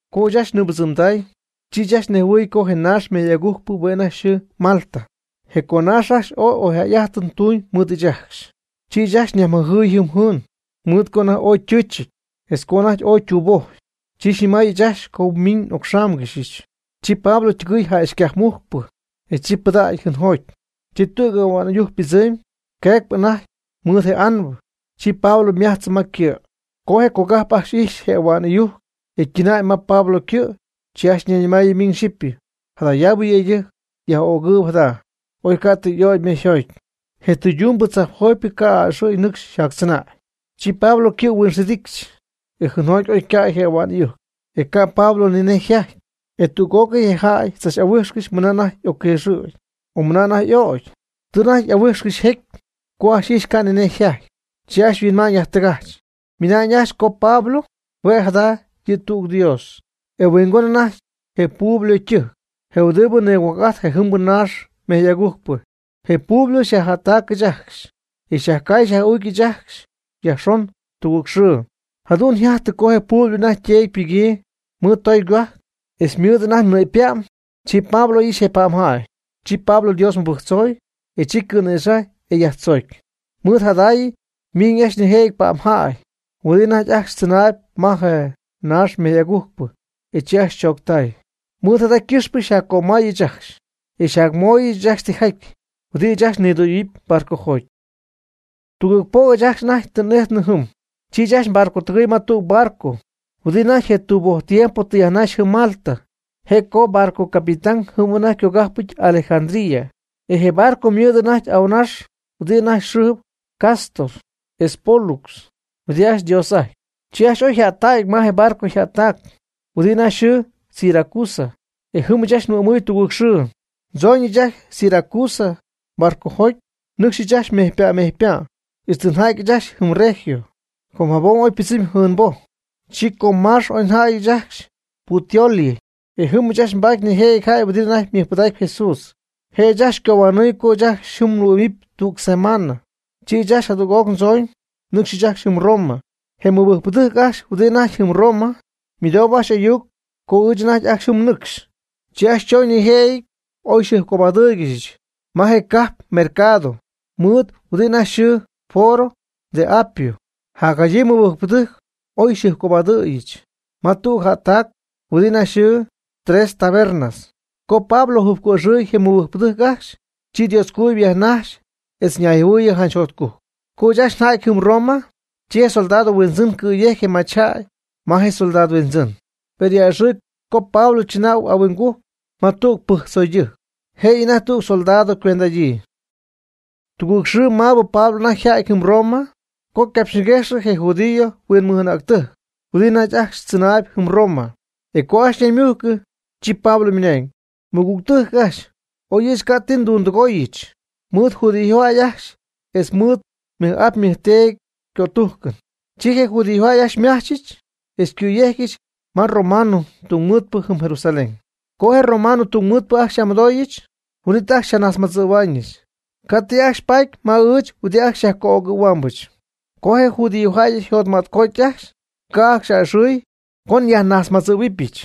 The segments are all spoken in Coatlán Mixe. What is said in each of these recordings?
Co ɨɨch ajcxy nɨɨbɨdzɨmday, chi ɨɨch ajcxy nejhuɨy co je naax mejy agujcpɨ hue' anajty yxɨɨ Malta. Je conaax ajcxy ooy oyjäy'ajtɨn tuuñ mɨɨd ɨɨch ajcxy, chi ajcxy yajmɨjɨɨy jɨɨn mɨj, mɨɨd co anajty ooy ytɨɨchɨty, etz co anajty ooy ytuubojy. Chi xyñɨmay ɨɨch ajcxy co miiñ n'ocxáamgɨxyɨch. Chi Pablo ytɨgɨɨy jäxycajpmujcpɨ, e chi pɨdacy jɨɨnjoty. Chi tüg ahua'n ɨyujc pɨdzɨmy, yquëgy anajty mɨɨd je anbɨ, chi Pablo ymajtzɨ ma ycɨ'. Co je cogajp ajcxy ijxy je ahua'n ɨyujc ytɨɨyñäy ma Pablo ycɨ', chi ajcxy ñayñɨmaayɨ miñ xyɨpy: ―Jadayaabɨ yëydɨjc, jäy yaj'öcpɨ jada. Oy ca' tɨ y'ögy mejyjoty, je tɨydumbɨ tzajpjotypɨ ca' a'ɨxɨ̈y nɨcxy yjactzɨnäy. Chi Pablo ycɨ' huinxidicxy, e jɨɨnjoty oy ycäy je ahua'n ɨyujc, e ca' Pablo ni nej yjajty. E tüg'ócɨy je jäy tzach'ahuijxcɨxy mɨna anajty y'ocquiixɨ̈gy, o mɨna anajty y'oc'ögy. Tɨ anajty ooy y'ahuijxcɨxy jecy; co ajcxy ijxy ca' ni nej yjaty, chi ajcxy yhuinma'ñ yajtɨgajch. Ymɨnañ ajcxy co Pablo hue' jada' yɨ' tüg dios. E mɨhuingon anajty je Publio ytɨjc, je huɨdi nigohuajc'ajty je jɨmbɨ naax mejy'agujcpɨ. Je Publio xyajjättacɨch ajcxy, e xyajcaay xyaj'uucɨch ɨɨch ajcxy yajxon tugɨɨg xɨɨ. Jadu'n yjajtɨ co je Publio anajty yteedy ypɨgyii mɨɨd tooy gohuajc etz mɨɨdɨty anajty nɨ'pypa'm. Chi Pablo oy ixy je pa'mjäy. Chi Pablo Dios mɨbɨjctzoy, e chi cɨ̈nïxajy, e yajtzoocy. Mɨɨd jadaay miñ ajcxy nijëjɨty pa'mjäy huɨdi anajty ajcxy tzɨnaayb ma je naax mejy'agujcpɨ e chi ajcxy chooctäy. Mɨɨd jada ycɨxpɨ nyajcömay ɨɨch ajcxy, e nyajmooyɨch ɨɨch ajcxy tijaty huɨdi ɨɨch ajcxy nidüyöyɨpy barcojoty. Tugɨɨg po' ɨɨch ajcxy anajty tɨ n'ijtnɨ jɨm. Chi ɨɨch ajcxy nbarcotɨgɨɨy ma tüg barco huɨdi anajty je tuuboj tiempo tɨ yajnaxy jɨm Malta. E je barco capitán jɨm anajty ycogajpɨty Alejandría. E je barco ymɨɨd anajty ahuɨnax huɨdi anajty yxɨɨ Cástor etz Pólux huɨdi ajcxy dios'ajtpy. Chi ɨɨch ajcxy oy njäty ma je barco jättac huɨdi anajty yxɨɨ Siracusa. E jɨm ɨɨch ajcxy nhuɨ'mɨɨy tugɨɨg xɨɨ. Ndzoñɨch ajcxy Siracusa barcojoty, nɨcxy ɨɨch ajcxy mejypa' mejypa', ixtɨ nja'tyɨch ajcxy jɨm Regio. Com jabom oy ypɨdzɨmy jɨɨnboj, chi co maax oy nja'ty ɨɨch ajcxy Puteoli. E jɨm ɨɨch ajcxy nbaaty nijëjɨty jäy huɨdi anajty mɨjpɨdaacp Jesús. Je' ajcxy xycohuanɨɨyɨch co ɨɨch ajcxy jɨm huɨ'mɨpy tüg semaan. Chi ɨɨch ajcxy jadüg'oc ndzooñ, nnɨcxyɨch ajcxy jɨm Roma. Je mɨbɨjcpɨdɨjc ajcxy huɨdi anajty jɨm Roma ymɨdou ajcxy ayuc co ɨɨch anajty ajcxy jɨm nɨcxy, chi ajcxy chooñ nijëjɨty oy xyjɨjpcobadɨ́ɨygɨxyɨch ma je cajp mercado mɨɨd huɨdi anajty yxɨɨ Foro de Apio. Jacjadyii mɨbɨjcpɨdɨjc oy xyjɨjpcobadɨ̈yɨch ma tüg jättac huɨdi anajty yxɨɨ, Tres Tabernas. Co Pablo jɨjpco'ixɨɨy je mɨbɨjcpɨdɨjc ajcxy, chi Dioscojuyip yajnaxy etz ñayjɨhuɨɨyɨ janch jotcujc. Co ɨɨch ajcxy nja'ty jɨm Roma, chi je soldado huindzɨn cɨ̈yejcy je machyjäy ma je comandante, per a'ɨxɨɨyb co Pablo tzɨnäy ahuingujc ma tüg pɨjctzoydɨjc, jëyɨ anajty tüg soldado ycuend'adyii. Tugɨɨg xɨɨ maabɨ Pablo anajty yjäty jɨm Roma co capxyñiguejxy je judío huinmɨj'anäctɨjc huɨdi anajty ajcxy tzɨnaayb jɨm Roma. E co ajcxy ñaymujcɨ, chi Pablo ymɨnañ: ―Mɨgügtɨjc ajcxy, oy ɨɨch ca' ti ndundɨgooyɨch mɨɨdɨ judío jäy ajcxy etz mɨɨd ajt nmɨj'ap nmɨjteedy ycötújcɨn, chi je judíojäy ajcxy xymajchɨch etz xycɨ̈yejcɨch ma romano tungmɨɨdpɨ jɨm Jerusalén. Co je romano tungmɨɨdpɨ ajcxy xy'amɨdooyɨch, huin'it ajcxy xyjanajtzmadzɨ̈huaañɨch, ca' ti ajcxy paaty ma ɨɨch huɨdi ajcxy xyajco'ögɨ̈huɨbɨch. Co je judíojäy yjotmätcoty ajcxy, ca' ajcxy a'ɨxɨ̈y co nyajnajtzmadzɨ̈huɨbɨch,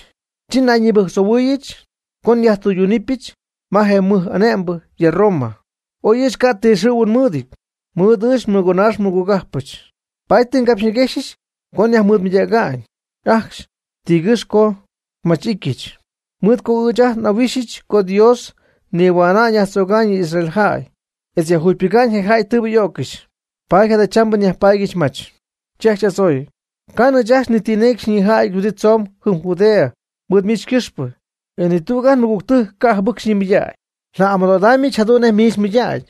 chi nayñibɨjctzohuɨɨyɨch co nyajtɨydunɨpyɨch ma je mɨj'ane'mbɨ ya Roma, oy ɨɨch ca' ti xɨ̈huɨn nmɨɨdɨty mɨɨd ɨɨch nmɨgonaax nmɨgogajpɨch. Paady tɨ ngapxyñiguejxcɨxy co nyajmɨɨdmɨydäga'ñ ajcxy tigɨ́x co nmach'ityɨch. Mɨɨd co ɨɨch ajt n'ahuijxɨm co Dios nihuäna'ñ yajnïdzöga'ñ yɨ Israel jäy etz yajjugypɨga'ñ je jäy tɨɨbɨ y'öccɨxy. Paady jadachambɨ nyajpaadyɨch mach. Chi ajcxy y'adzooy: ―Ca'nɨ ɨɨch ajcxy ni ti necy xyñijäty huɨdi tzoomb jɨm Judea mɨɨd miich ycɨxpɨ. E ni tüg ajt nmɨgügtɨjc ca' jɨbɨc xyñimɨydägy. Nja'amɨdo'idaamyɨch jadu'n nej miich mmɨydägy,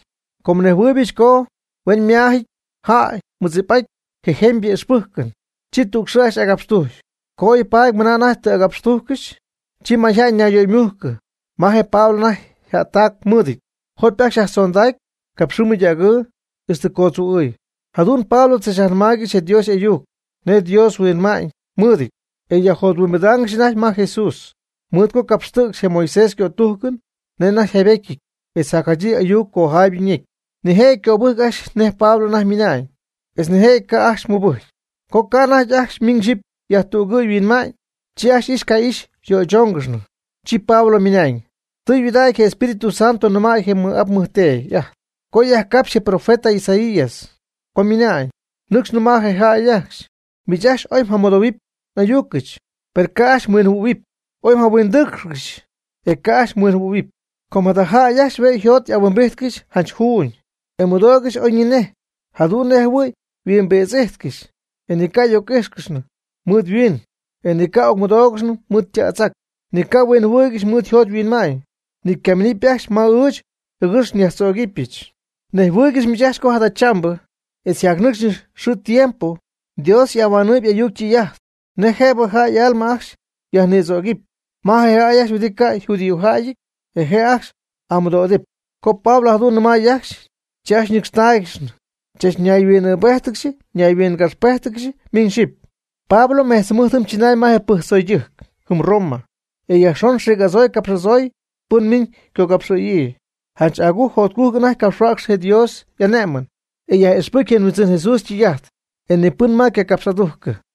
com nnejhuɨybɨch co huen yma'ámyɨty jäy ymɨdzip'ajty je jemybɨ y'ijxpɨjcɨn. Chi tüg xɨɨ ajcxy agapxtujcy. Co oy paady mɨna anajty tɨ agapxtujccɨxy, chi mayjäy ñayyöymujcɨ ma je Pablo anajty jättac mɨɨdɨty. Jopy ajcxy yajtzondacy capxɨɨ mɨydägɨɨ ixtɨ ycootztzuu'ɨɨy, jadu'n Pablo tzachyajnɨmaaygɨxy je Dios y'ayuc nej Dios yhuinma'ñ mɨɨdɨty. E yajjothuimbidaangɨxy anajty ma je Jesús mɨɨd co capxtɨ̈cxy je Moisés ycötujcɨn nej anajty yjaybetyɨty, etz jacjadyii ayuc cojaaybɨ ñecy. Nijëjɨty cöbɨjc ajcxy nej Pablo anajty ymɨna'ñ, etz nijëjɨty ca' ajcxy mɨbɨjcy. Co ca' anajty ajcxy miñ xyipy yajtügɨɨy yhuinma'ñ, chi ajcxy ixy ca'ixy yöychóongɨxnɨ. Chi Pablo ymɨnañ: ―Tɨytudägy je Espíritu Santo nɨmay je nmɨj'ap nmɨjteedy ajt co yajcapxy je profeta Isaías co ymɨnañ: Nɨcx nɨma' je jäy ajcxy: Miich ajcxy oy mjamɨdohuɨpy n'ayucɨch, per ca' ajcxy mhuinjɨhuɨ̈huɨp; oy mjahuindɨ́ɨcxcɨxɨpy, e ca' ajcxy mhuinjɨhuɨ̈huɨpy. Com jada jäy ajcxy hue' yjot'ahuimbijtcɨxy janch juuñ, e ymɨdoogɨxy oyñinej, jadu'n nej jɨhuɨy yhuimbïdz'ijtcɨxy, e ni ca' y'oc'íjxcɨxy mɨɨd yhuiin e ni ca' ocmɨdoogɨxy mɨɨd yta'tz'ac, ni ca' huinjɨhuɨɨygɨxy mɨɨd yjot yhuinma'ñ, ni ca' minɨpy ajcxy ma ɨɨch jɨgɨx myajtzögɨbɨch. Nejhuɨ́ɨygɨxy miich ajcxy co jadachambɨ etz jacnɨcxpɨ xɨɨ tiempo Dios y'ahuanɨɨyb y'ayuc ytɨy'ajt nej jëbɨ jäy y'alma ajcxy yajnïdzögɨpy ma je jäy ajcxy huɨdi ca' yjudíojäyɨty, e je' ajcxy y'amɨdo'idɨpy. Co Pablo jadu'n nɨmay ajcxy, chi ajcxy ñɨcxtáaygɨxnɨ chach ñayhuin'ɨɨbéjtɨgɨxy ñayhuingapxpéjtɨgɨxy miñ xyɨpy. Pablo mejtz jɨmɨjt jɨm chɨnay ma je pɨjctzoydɨjc jɨm Roma, e yajxon xiic'adzoy capx'adzoy pɨn miñ ycogapxɨ̈yii. Janch agujc jotcujc anajty capxhuäcxy je Dios y'ané'mɨn, e yaj'ixpɨcy je Huindzɨn Jesús ytɨy'ajt, e ni pɨn ma ycapx'adugyii.